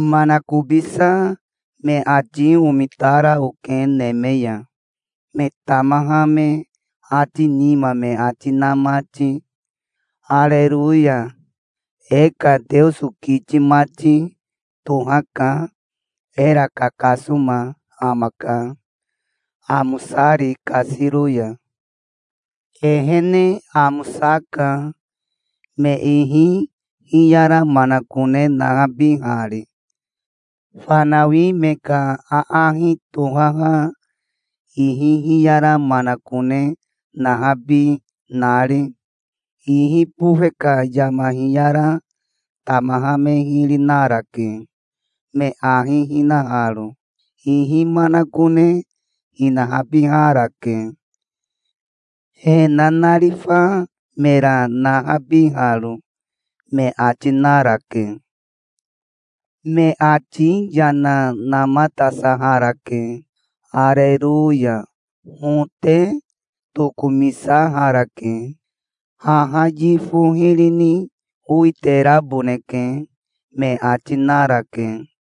Manakobisa me ati omitara oke neme ya, me tamaha me ati nima me ati na mati. "Areroya. E ka Teoso kiti mati tohaka. Era kakasoma amaka, amosari kasiro ya. Ehene amosaka, me ihi hiyara manakone nahabihari, fanawi me ka aahi tohaha ihi hiyara manakone nahabi nari. Ihi bofe ka yama hiyara tamaha me hiri narake, me ahi hinaharo. Ihi manakone hinahabiharake, he nanarifa mera nahabiharo", me ati narake. Me ati yana namatasaharake. "Areroya. Hote tokomisaharake. Haha yifo hiri ni owiteraboneke", me ati narake.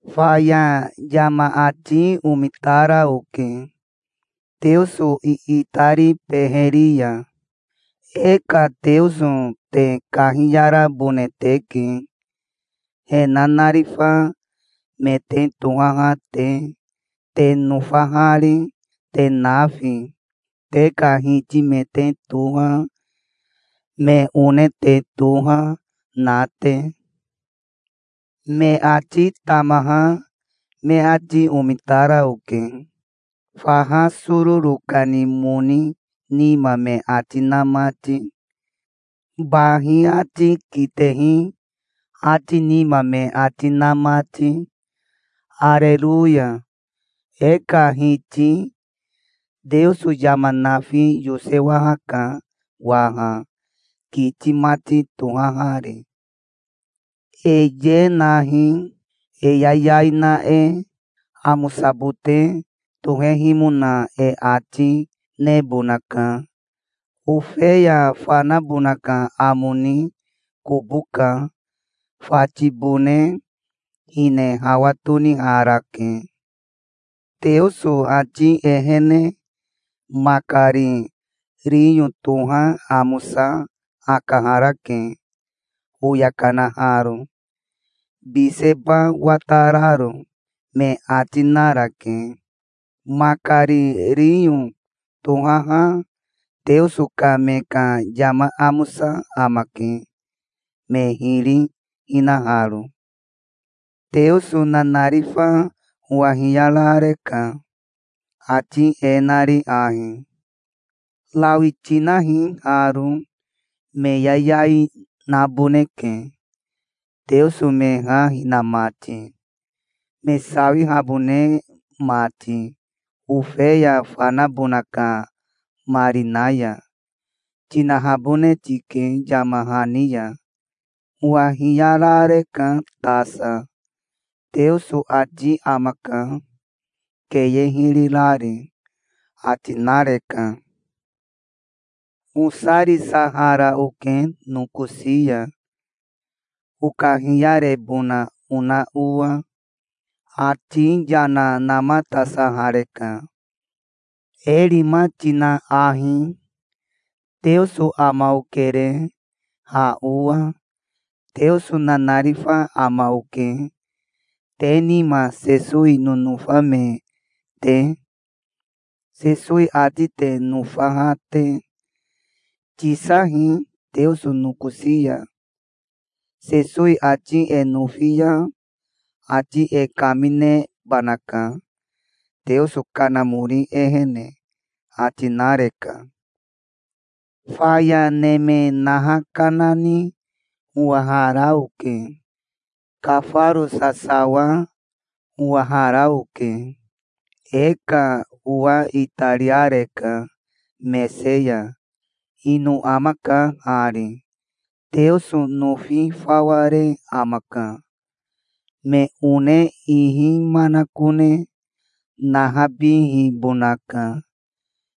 Faya yama ati omitara oke Teoso iitari beheri ya. "E ka Teoso te kahiyarabone teke, he nanarifa me te tohaha te, te nofahari, te nafi, te ka hiti me te toha, me one te toha na te". Me ati tamaha me ati omitara oke, faha sororo kani moni nima me ati na mati, bahi ati kitehi ati nima me ati na mati. "Areroya. E ka Hiti Teoso yama nafi yosewahaka waha, kiti mati tohahari. E ye nahi, e yayai na e. Amosabote tohehimona e ati nebonaka. Ofeya fanabona ka amo ni kobo ka. Fatibone hine hawa toniharake. Teoso ati ehene makari riyo toha amosa akaharake, oya kanaharo, biseba watararo", me ati narake. Makari riyo tohaha Teoso ka me ka yama amosa amake, me hiri hinaharo. Teoso nanarifa owa hiyarareka, ati e nari ahi: "Rawi tinahi haro. 'Me yayai naboneke, Teoso me ha hina mati, me sawihabone mati Ofeya fanabona ka marina ya', tinahabone tike yama hani ya". Owa hiyarareka tasa. "Teoso ati amaka, keye hiri rari", ati nareka. Osarisahara oke nokosi ya okahiyarebona ona owa. Ati yana namatasahareka. "E rima tina ahi. Teoso ama okere ha owa. Teoso nanarifa ama oke te nima Sesowi nonofa me te, Sesowi ati te nofaha te. Tisahi Teoso nokosi ya. Sesowi ati e nofi ya ati e kaminebanaka, Teoso Kanamori ehene", ati nareka. Faya neme naha kanani owahara oke. Kafaro sasawa owahara oke. E ka owa itariareka mese ya. Ino amaka hari, Teoso nofi fawa re amaka. Me one ihi manakone nahabihibonaka,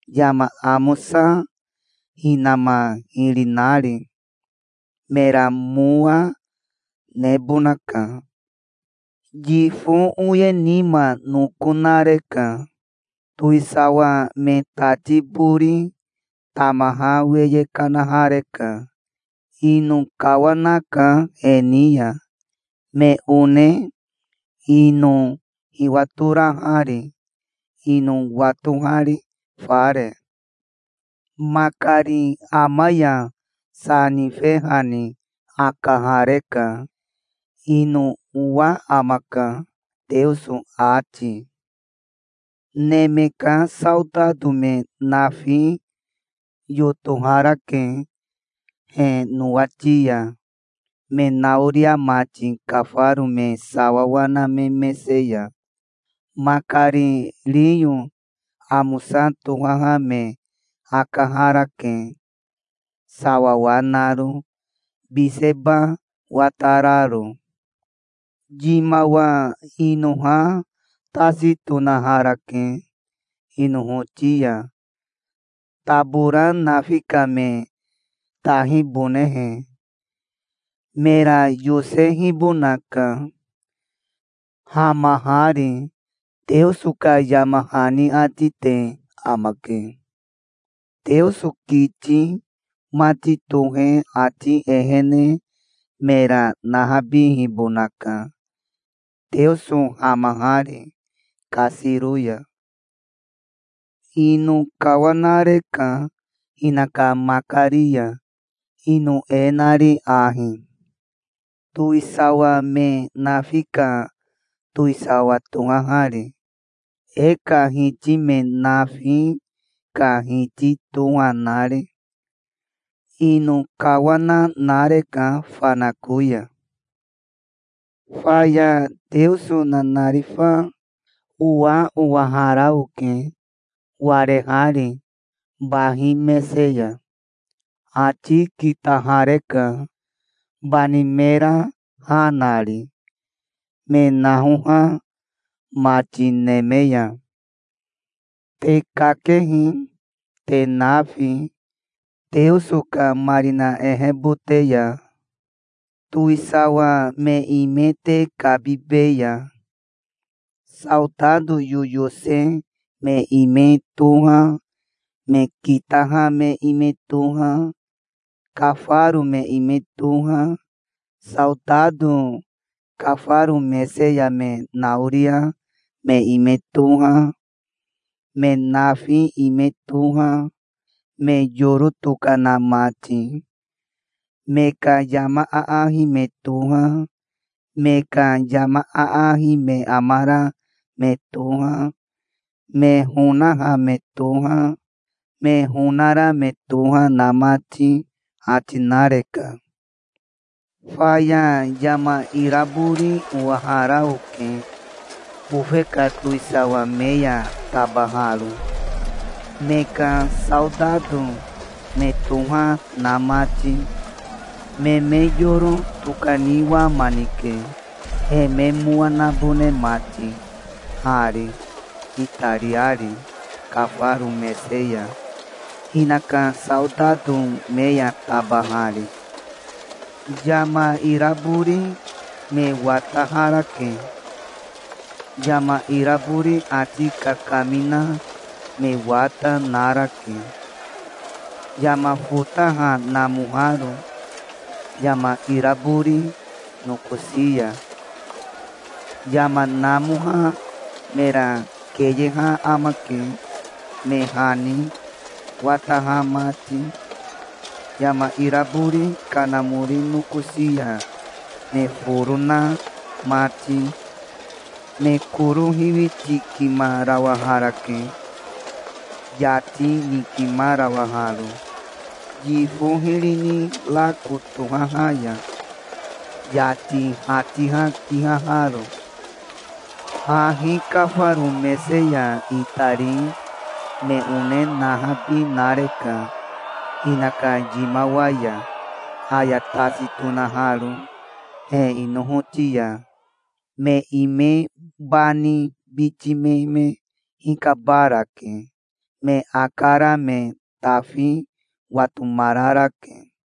yama amosa hinama hiri nari. Mera mowa, nebonaka. Yifo oye nima noko nareka. Towisawa me tati bori tamaha weye kanahareka. Ino kawanaka he ni ya, me one ino hiwatorahari, ino watohari, fare. Makari ama ya sa nifehani akahareka. Ino owa amaka, Teoso ati. Neme ka saotato me nafi yotoharake he nowati ya, me naoria mati kafaro me sawawa na me mese ya. Makari riyo amosa tohaha me akaharake, sawawa naro, biseba watararo. Yimawa inoha tasi tonaharake inohoti ya, tabora nafi ka me tahibonehe. "Mera yosehibonaka, hamahari", Teoso ka yama hani ati te amake. Teoso kiti mati tohe ati ehene mera nahabihibonaka, Teoso hamahari kasiro ya. Ino kawanareka hinaka makari ya, ino e nari ahi, towisawa me nafi ka towisawa tohahari, e ka Hiti me nafi ka Hiti toha nari. Ino kawana nareka fanako ya. Faya Teoso nanarifa owa owahara oke, warehari bahi mese ya. Ati kitahareka, bani mera ha nari, me nahoha mati neme ya. "Te kakehi, te nafi, Teoso ka marina ehebote ya. Towisawa me ime te kabibeya. Saotato yoyose me ime toha, me kitaha me ime toha, kafaro me ime toha, saotato kafaro mese ya me naoria me ime toha, me nafi ime toha, me yoro tokana mati, me ka yama aahi me toha, me ka yama aahi me amara me toha, me honaha me toha, me honara me toha na mati", ati nareka. Faya yama irabori owahara oke bofe ka towisawa me ya tabaharo, me ka saotato me toha na mati. Me me yoro tokaniwamanike, he me mowa nabone mati hari, itariari kafaro mese ya, hinaka saotato me ya tabahari. Yama irabori me wataharake. Yama irabori ati kakamina me wata narake, yama fotaha namoharo yama irabori nokosi ya. Yama namoha mera keyeha amake, me hani wataha mati, yama irabori kanamori nokosi ya me foro na mati. Me koro hiwitikimarawaharake, yati nikimarawaharo, yifo hiri ni rako tohaha ya, yati hatiha kihaharo. Hahi kafaro mese ya itari me one nahabi nareka hinaka yimawa ya, aya tasi tonaharo he inohoti ya. Me ime bani biti me me hikabarake. Me akara me tafi watomararake.